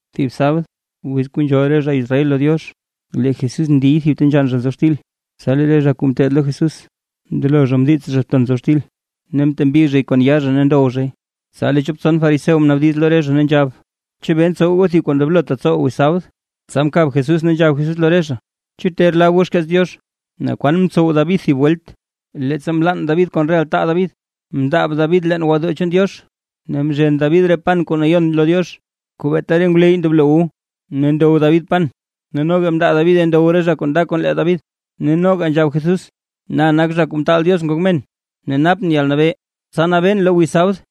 Thib sabd, wiz kuu nzhool re zha Israel lo Diox, lee Jesús ndiy thib ta nzhann zha nzob xtil, tsa lee re zha kuu ngeteed lo Jesús mndelo zha mdiits zha ton nzob xtil, ne mtembi zhay kon yaa zha ne ndow zhay, tsa lee chop tson fariseo mnaabdiz lo re zha, ne nzhab: ―¿Chebee ntsow goo thib kuu ndoblotaa tsowaa wiz sabd? Tsa mkab Jesús, ne nzhab Jesús lo re zha: ―¿Chu ter lab goo xkeets Diox, naa kwan mtsow David thib welt, leettsa mlann David kon re altaa David? Mndaab David leen gwodoo chaan Diox, ne mzhen David re pan kuu Nayon lo Diox, kuu beeta re ngwleyy ndoblo wu, ne ndow David pan ne noga mndaa Davide ndow re zha kuu nda kon lee David. Ne noga nzhab Jesús: ―Na nak Zha Kuu Mtaal Diox Ngok Men ne napʼn yalnabee, tsa nabeen lo wiz sabd.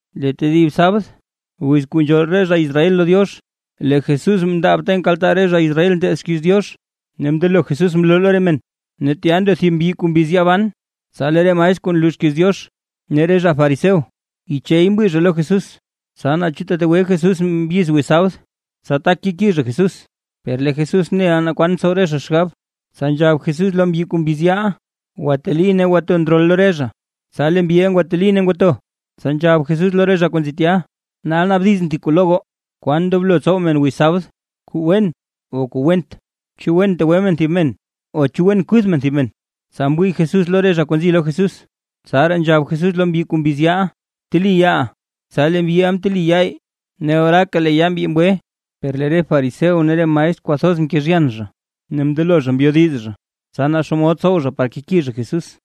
Lee tedib sabd, wiz kuu nzhool re zha Israel lo Diox, lee Jesús mndaab ta nkaltaa re zha Israel nteed xkiiz Diox, ne mndelo Jesús mloo lo re men. Ne tya ndo thib mbyi kuu mbiz yaa ban. Tsa lee re maestr kuu nloo xkiiz Diox ne re zha fariseo yichey mwii lo Jesús, tsa naa chu tetegwe Jesús mbyiz wiz sabd, tsa tak keki zha Jesús. Per lee Jesús neʼa naa kwan ntsow re zha xgab, tsa nzhab Jesús lo mbyi kuu mbiz yaaʼa: ―Gwateli ne bto ndrol lo re zha. Tsa lee mbyiʼa ngwateli ne ngwato. Tsa nzhab Jesús lo re zha kuu nzi tya: ―Nal naabdizʼn thib kuu lo goo: ¿Kwan ndoblo tsow men wiz sabd, kuu wen o kuu went? ¿Chu wen tegwe men thib men, o chu wen kuth men thib men? Tsa mwii Jesús lo re zha kuu nzi lo Jesús, tsaraa nzhab Jesús lo mbyi kuu mbiz yaaʼa: ―Bteli yaaʼa. Tsa lee mbyiʼa mteli yaa, ne oraaka lee yaa mbyi mgwe. Per lee re fariseo ne re maestr kwathoz mkezhyan ne mndelo mbyodiz, tsa naa xomod tsow zha par keki zha Jesús.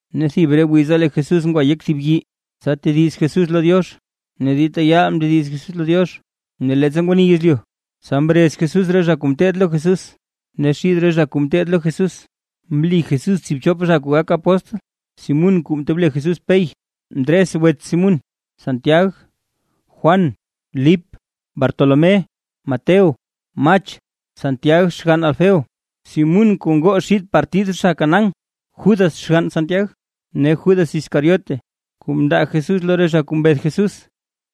Ne thib re wiza lee Jesús ngwa yek thib yii, tsa tediz Jesús lo Diox, ne dita yaal mndediz Jesús lo Diox. Ne leettsa ngwani yezlyu, tsa mrez Jesús re zha kuu ngeteed lo Jesús, ne xid re zha kuu ngeteed lo Jesús mli Jesús tsiibchop zha kuu gak apóstl. Simún (kuu mtob le Jesús Pey), Ndres (wets Simún), Santiag, Juan, Lip, Bartolomé, Mateo, Mach, Santiag (xgann Alfeo), Simún (kuu ngoo xid partid zha Canaán), Judas (xgann Santiag) ne Judas Iscariote (kuu mndaa Jesús lo re zha kuu mbeth Jesús).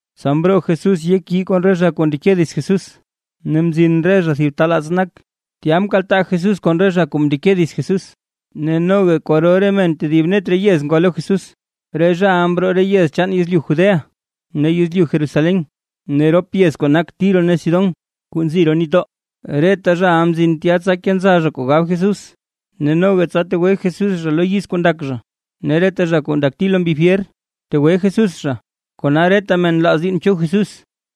Tsa mroo Jesús yek yii kon re zha kuu ndeke dits Jesús, ne mzin re zha thib ta laats nak. Tya mkaltaa Jesús kon re zha kuu mndeke dits Jesús, ne noga kwaro re men tedib net re yez ngwa lo Jesús, re zhaʼa mroo re yez chaan yezlyu Judea ne yezlyu Jerusalén, ne rop yez kuu nak Tiro ne Sidón kuu nzi roo nitdoo. Reta zhaʼa mzin tya tsa kenza zha kuu gab Jesús, ne noga tsa tegwe Jesús zha lo yiz kuu ndak zha. Ne reta re zha kuu ndakti lo mbi fyer, mtegwe Jesús zha. Kona reta men nlaaz diinn cho Jesús,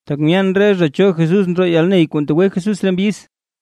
tak myeen re zha cho Jesús ndroo yalney kuu ntegwe Jesús re mbyiz.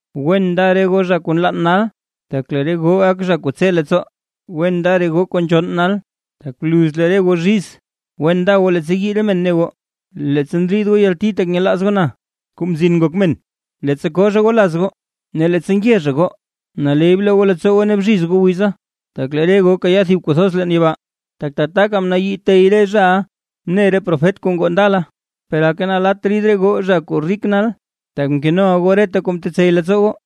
’Wen nda re goo zha kuu nlann nal, tak lee re goo gak zha kuu tse leettsoo. ’Wen nda re goo zha kuu nzhonn nal, tak bluz lee re goo zhiz. ’Wen nda goo leettsa yii re men ne goo, leettsa ndriid goo yalti tak nyelaaz goo na, Kuu Mzin Ngok Men, leettsa koo zha goo laz goo, ne leettsa nge zha goo. Naley bloo goo leettsoo goo ne bzhiz goo wiza, tak lee re goo kayaa thib kuu thoz leen yibaa, tak tataka mnayii re tey re zhaʼa mne re profet kuu ngoo ndala. ’Per aka nalatt rid re goo zha kuu rik nal, tak mkenoʼa goo reta kuu mtetsey leettsoo goo.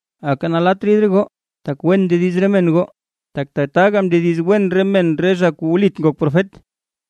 ’Aka nalatt rid re goo tak wen ndediz re men goo, tak tataka mndediz wen re men re zha kuu wlit ngok profet.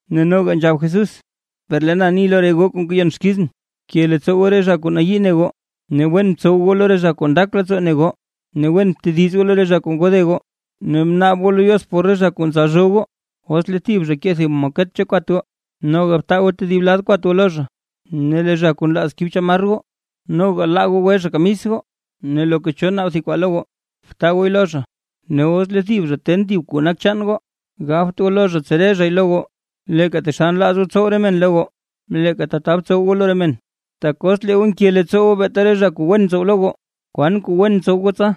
Ne noga nzhab Jesús: ―Per lee na ni lo re goo kuu ngeyon xkizʼn: Bke leettsoo goo re zha kuu nayii ne goo, ne wen btsow goo lo re zha kuu ndak leettsoo ne goo. Ne wen btediz goo lo re zha kuu ngode goo, ne bnaab goo lo Diox por re zha kuu ntsalzhoo goo. Os lee thib zha kee thib maket cho kwat goo, noga btaa goo tedib lad kwat goo lo zha. Ne lee zha kuu nlaaz kib chamar goo, noga laa goo gwe zha kamis goo. Ne loka cho naab thib kwaa lo goo, btaa gooy lo zha, ne os lee thib zha ten thib kuu nak chaan goo, gabt goo lo zha tsere zhay lo goo. Leeka taxal nlaaz goo tsow re men lo goo, leeka tata btsow goo lo re men. ’Tak os lee goo nke leettsoo goo beeta re zha kuu wen ntsow lo goo, ¿kwan kuu wen ntsow goo tsa?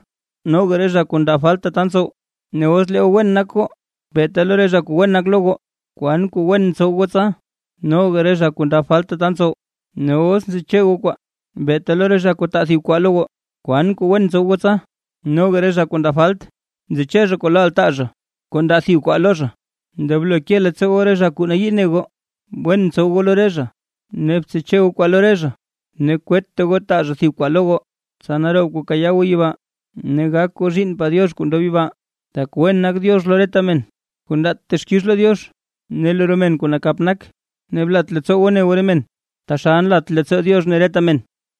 Noga re zha kuu ndab falt tata ntsow. Ne os lee goo wen nak goo beeta lo re zha kuu wen nak lo goo, ¿kwan kuu wen ntsow goo tsa? Noga re zha kuu ndab falt tata ntsow. Ne os ntseche goo kwaa beeta lo re zha kuu taa thib kwaa lo goo, ¿kwan kuu wen ntsow goo tsa? Noga re zha kuu ndab falt, ntseche zha kwaa lo altaa zha kuu ndaa thib kwaa lo zha. Ndoblo ke leettsoo goo re zha kuu nayii ne goo, wen btsow goo lo re zha, ne btseche goo kwaa lo re zha, ne kwetta goo taa zha thib kwaa lo goo, tsa naroob kwaa kayaa goo yibaa, ne gak goo zhiinnpaa Diox kuu ndob yibaa, tak wen nak Diox lo reta men kuu ndaat texkix lo Diox ne lo re men kuu nakap nak. Ne blat leettsoo goo ne goo re men, taxal nlat leettsoo Diox ne Diox reta men.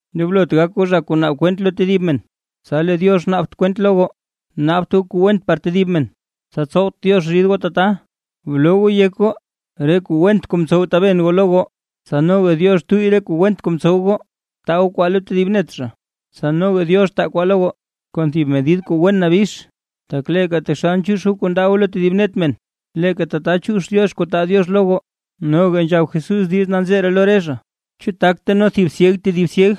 ’Ndoblot gak goo zha kuu naab kwent lo tedib men, tsa lee Diox naabt kwent lo goo. Naabt goo kuu went par tedib men, tsa tsowt Diox rid goo tata. Bloo goo yek goo re kuu went kuu mtsow taben goo lo goo, tsa noga Diox tuyy re kuu went kuu mtsow goo. Taa goo kwaa lo tedib net zha, tsa noga Diox taa kwaa lo goo, kon thib medid kuu wen nabix. Tak leeka taxal nchiix goo kuu ndaa goo lo tedib net men, leeka tata chiix Diox kuu taa Diox lo goo. Noga nzhab Jesús diiz nanzee ree lo re zha: ―¿Chu tak teno thib syeg tedib syeg?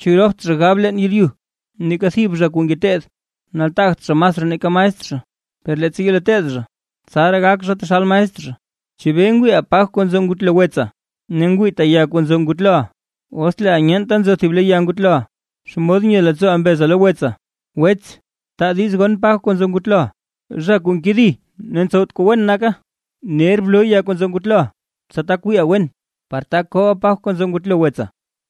¿Chu ropt zha gab leen yeeryu? Neeka thib zha kuu ngeteed nataagt zha masraa nake maestr zha, per leettsa yelo teed zha, tsaraa gak zha taxal maestr zha. ’¿Chebee ngwiiʼa paj kuu nzo ngutlo wetsa, ne ngwiita ya kuu nzo ngutloʼa? Os leeʼa nyeenta nzo thib le ya ngutloʼa, ¿xomod nye leettsooʼa mbeza lo wetsa: “Wets, taa diiz gon paj kuu nzo ngutloʼa”? ¡Zha kuu nkedi ne ntsowt kuu wen naka! Ner bloo ya kuu nzo ngutloʼa, tsa tak wiiʼa wen, par tak kooʼa paj kuu nzo ngutlo wetsa.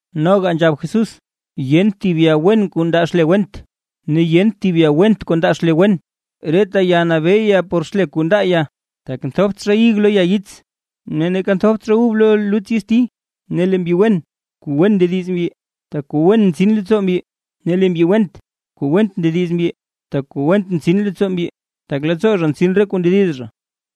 Noga nzhab Jesús: ―Yent thib ya wen kuu ndaa xle went, ne yent thib ya went kuu ndaa xle wen. Reta ya nabee ya por xle kuu ndaa ya, tak nthopt zha ig lo ya yits, ne neeka nthopt zha ub lo luts yitsti. Lee mbyi wen, kuu wen ndediz mbyi, tak kuu wen ntsin leettsoo mbyi. Ne lee mbyi went, kuu went ndediz mbyi, tak kuu went ntsin leettsoo mbyi. Tak leettsoo zha ntsin reta kuu ndediz zha.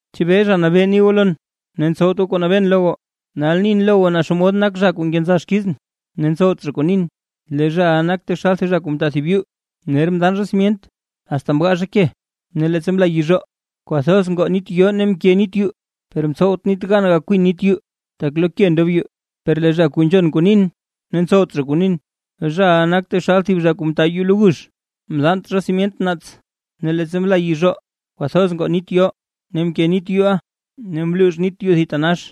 ’¿Chebee Zha Nabee ni goo lon, ne ntsowt goo kuu nabeen lo goo? Nal nin lo goo naa xomod nak zha kuu nkenza xkizʼn ne ntsow kuu nin. Lee zhaʼa nak taxal thib zha kuu mta thib yuu. Ner mdaan zha simyent, asta mgaa zha ke, ne leettsa mla yizhoo, kwathoz ngoo nit yoo ne mke nit yuu, per mtsowt nit gan gakwin nit yuu, tak lo ke ndob yuu. Per lee zha kuu nzhon kuu nin, ne ntsowt kuu nin, zhaʼa nak taxal thib zha kuu mta yuu lo gux, mdaant zha simyent naats. Ne leettsa mla yizhoo kwathoz ngoo nit yoo, ne mke nit yuuʼa ne mluux nit yuu thitanax.